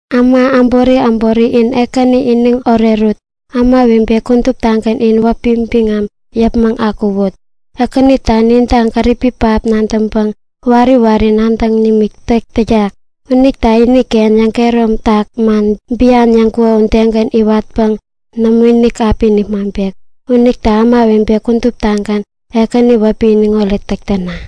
Äma äbori äbori, in Ekäni iniŋ orerut! Ämawebe kuduptagän in wäpi biŋam yäpmäŋ akuwut! Ekänitä ninta gäripi pähap nadäŋpäŋ wari wari nadäŋ nimikinik täk täyak. Unita iniken yäŋkehäromtak man bian yäŋkuko udegän iwatpäŋ nämoinik api nipmaŋpek. Unita ämawebe kuduptagän Ekäni wäpi iniŋoret täkäna!